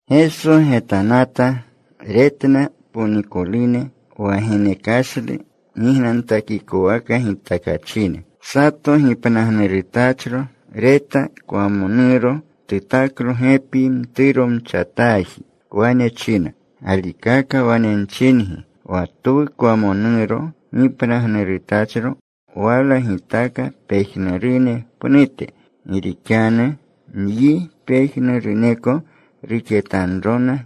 Geso getanata. Retna ponikolune, wa genekashlu gignantakikowaka gitakachine. Sato gipnagnurutachro reta kwamonuro. Tutaklo gepi mturomchataaji. Wane china, “Galikaka wane nchingi, wa twu kwamonuro gipnagnurutachro wala gitaka pejnurune pnute. Gi rixanu nyi pejnuruneko ruxetanrona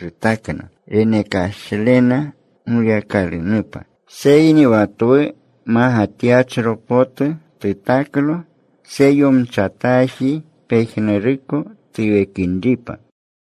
rutakna renekashlena Goyakalunupa. Seyni wa twu magatyachro potu tutaklo tseyomchataaji, pejnuruko tuwekinripa.”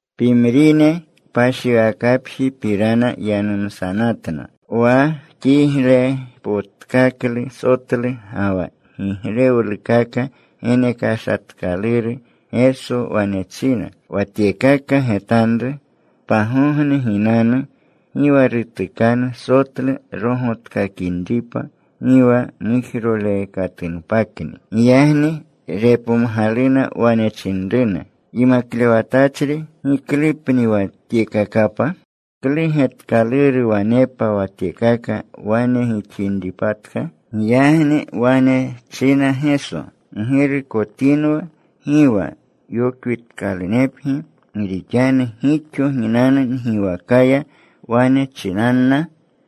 Pimrine kpashiwakapjipirana yanumsanatna, wa kiglepotkaklu sotlu ga wa giglewlukaka genekashatkaluru. Geso wane china, “Wa tyekaka getanru. Pagogne ginanu gi wa rutukanu sotlu rogotkakinripa, gi wa mujrolekatunpakni.” Giyagni repomgaluna. Wane chinruna, “Yimaklewatachri, ¿giklupni wa tyekakapa? ¿Klu getkaluru wanepa wa tyekaka wane gixinripatka?” Giyagni wane china Geso, “Ggirukotinwa gi wa yokwitkalunepgi. Gi rixanu gixo ginanu ngiwakaya. Wane chinanna,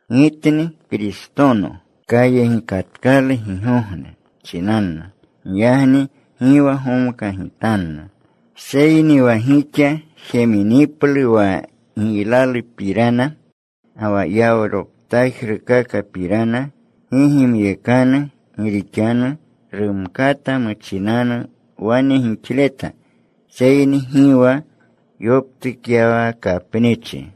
‘Gitni. Kayegikatkalu gigogne,’ chinanna. Giyagni gi wa gomkajigitanna. Seyni wa gixa jeminiplu wa giylalupirana ga wa yawroptajrukakapirana, gi gimyekanu. Gi rixanu rumkata muchinanu wane gixleta, seyni gi wa yoptukyawakapnichi.”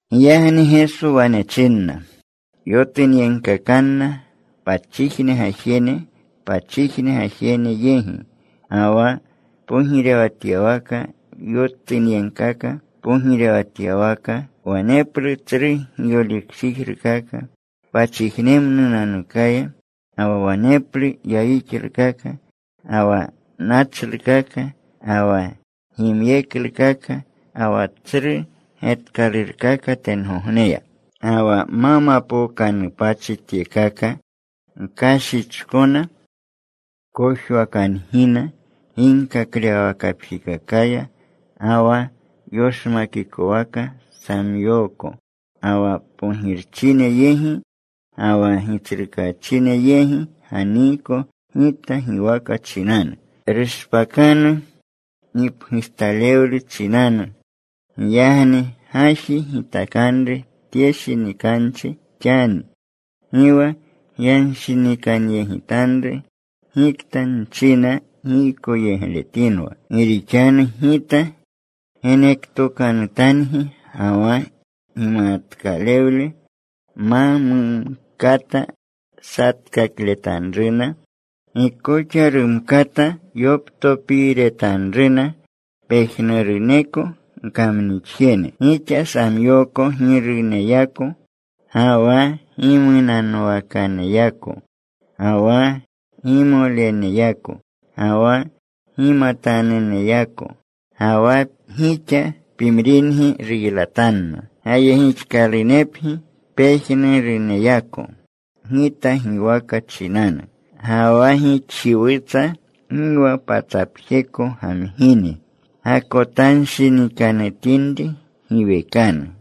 Giyagni Geso wane chinna, “Yotunyegkakanna pachijne gajene pachijne gajene yegi, ga wa pogirewatyawaka yotunyegkaka pogirewatyawaka. Waneplu tsru giyolikchijrukaka pachijnemnunanukaya. Ga wa waneplu yayixlukaka, ga wa nachlukaka, ga wa gimyeklukaka, ga wa tsru getkalurkaka tengogneya. “Ga wa ma mapookanupachi tyekaka, gkashichkona. Kojwakangina. Ginkaklewawakapjikakaya ga wa yoshmakikwaka nsamyooko. Ga wa pogirchine yegi ga wa gitsrukaachine yegi ganiiko Gita giwaka chinanu. Rushpakanu gipgujtalewle chinanu. Giyagni gaji gitakanru tye shinikanchi xani, gi wa gyanshinikanyegitanru gikta nchina giykoyegletinwa. Gi rixanu Gita genektokanutangi ga wa gimatkalewle ma mumkata satkakletanruna, gi koxa rumkata yoptopiiretanruna pejnuruneko gkamnixjene. Gixa samyooko giruneyako, ga wa gimunanwakaneyako, ga wa gimoleneyako, ga wa gimatanuneyako. Ga wa gixa pimringi ruylatanna. Gayegixkalunepgi pejnuruneyako Gita giwaka chinanu. Ga wa gixjiwutsa gi wa patsapjeko gamgingi. Gakotanshinikanutinri, giwekanu.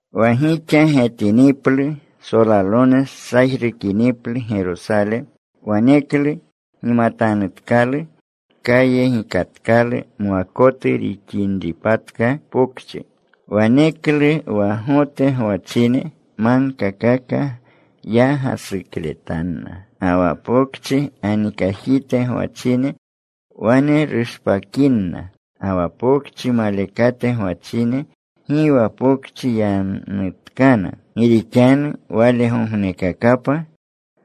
“Wa gixa getiniplu solalone sajrukiniplu Gerosale, waneklu gimatanutkalu kayegikatkalu mwakotu rixinripatka pokchi. Waneklu wa Gote gwachine magkakaka ya gasukletanna. Ga wa pokchi ganikajite gwachine wane rushpakinna. Ga wa pokchi malekate gwachine gi wa pokchi yanutkana. Gi rixanu walegognekakapa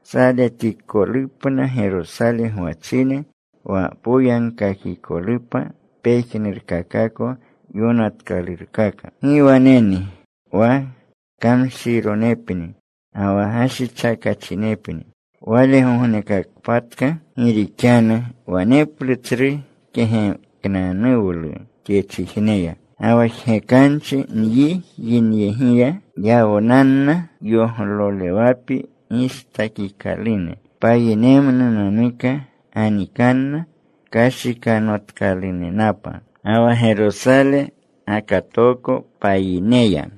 saletikolupna Gerosale gwachine, wa poyagkakikolupa pejnurkakako yonatkalurkaka. ¡Gi waneni wa kamshironepni ga wa gashichakachinepni walegognekakpatka! Gi rixanu waneplu tsru kegeknanuwlu tye chijiya, ga wa jgekanchi nyi yinyegiya. Yawnanna yoglolewapi gistakikalune. Payinemnunanuka ganikanna kashikanotkalunenapa. Ga wa Gerosale gakatooko payineya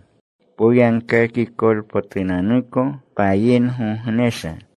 poyagkakikolpotunanuko payingognesha.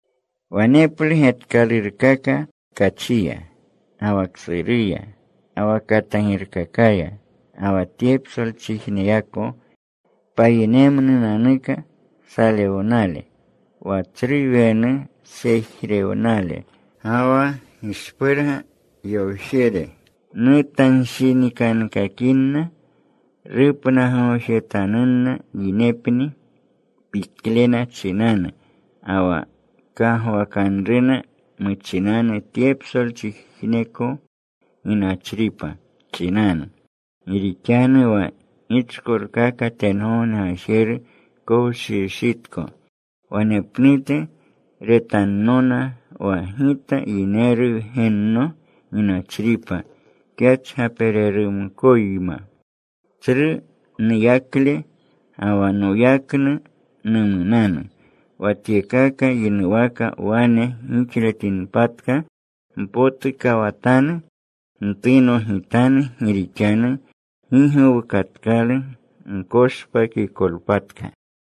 “Waneplu getkalurkaka tkachiya, ga wa ksuruya, ga wa katagirkakaya, ga wa tye psolchijneyako payinemnunanuka salewnale. Wa tsru wenu sejrewnale ga wa gishpurga yowjere nutanshinikankakinna. Rupnagoojetanunna yinepni piklena chinanu, ga wa kagwakanruna chinanu tye psolchijneko ginachripa chinanu. Gi rixanu wa gichkolkaka tengogne gajeru kowshiwshitko. Wanepnute retannona wa Gita yineru Wgenno ginachripa kyachgapereruyma. Tsru nuyakle ga wa noyaknu numunanu. Wa tyekaka yinuwaka wane gixletinpatka, mpotukawatanu. Ntunogitanu. Gi rixanu gi gowukatkalu gkoshpakikolpatka.”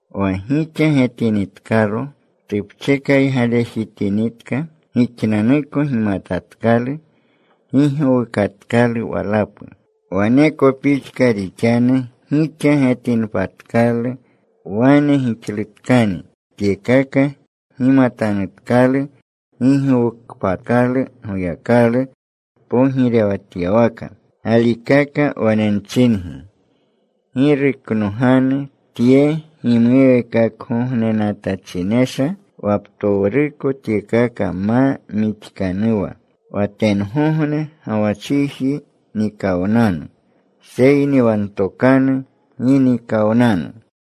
Wa gixa getinitkalo tupchekaygalejitinitka, gixnanuko gimatatkalu gi gowukatkalu walapu. Waneko pixka rixanu gixa getinpatkalu wane gixlutkani tyekaka, gimatanutkalu gi gowukpatkalu Goyakalu pogirewatyawaka. “Galikaka wane nchingi, gi ruknoganu tye gimuweekakgognenatachinesha, wa ptowruko tyekaka ma mixkanuwa. Wa tengogne ga wa chiji nikawnanu, seyni wa ntokanu gi nikawnanu.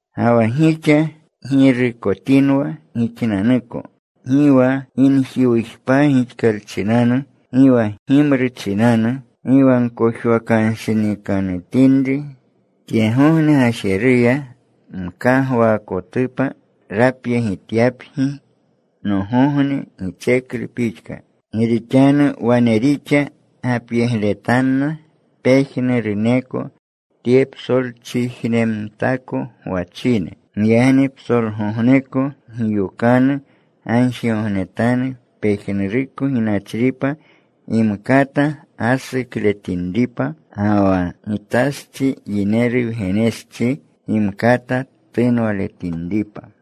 “Ga wa gixa girukotinwa gixnanuko, gi wa ginjiwujpa gixkalchinanu, gi wa gimru chinanu, gi wa gkojwakanshinikanutinri tyegogne gajeruya, mkagwaakotupa rapyegityapgi nogogne gitseklu pixka. Gi rixanu wane rixa gapyegletanna pejnuruneko tye psolchijnemtako gwachine. Giyagni psolgogneko giyokanu. Gagjigognetanu pejnuruko ginachripa gimkata gasukletinripa, ga wa Gitastsi, Yineru Wgennostsi gimkata tunwaletinripa.”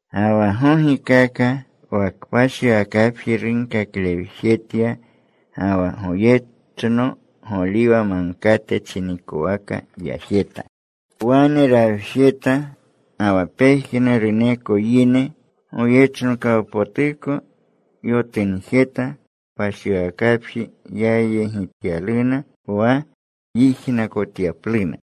Ga wa gogikaka, wa kpashiwakapji runkaklewjetya. Ga wa goyechno Goliwa Magkate chinikowaka yajeta. Wane rawjejeta. Ga wa pejnuruneko yine goyechnokawpotuko yotunjeta. Kpashiwakapji yayegityaluna wa yijnakotyapluna.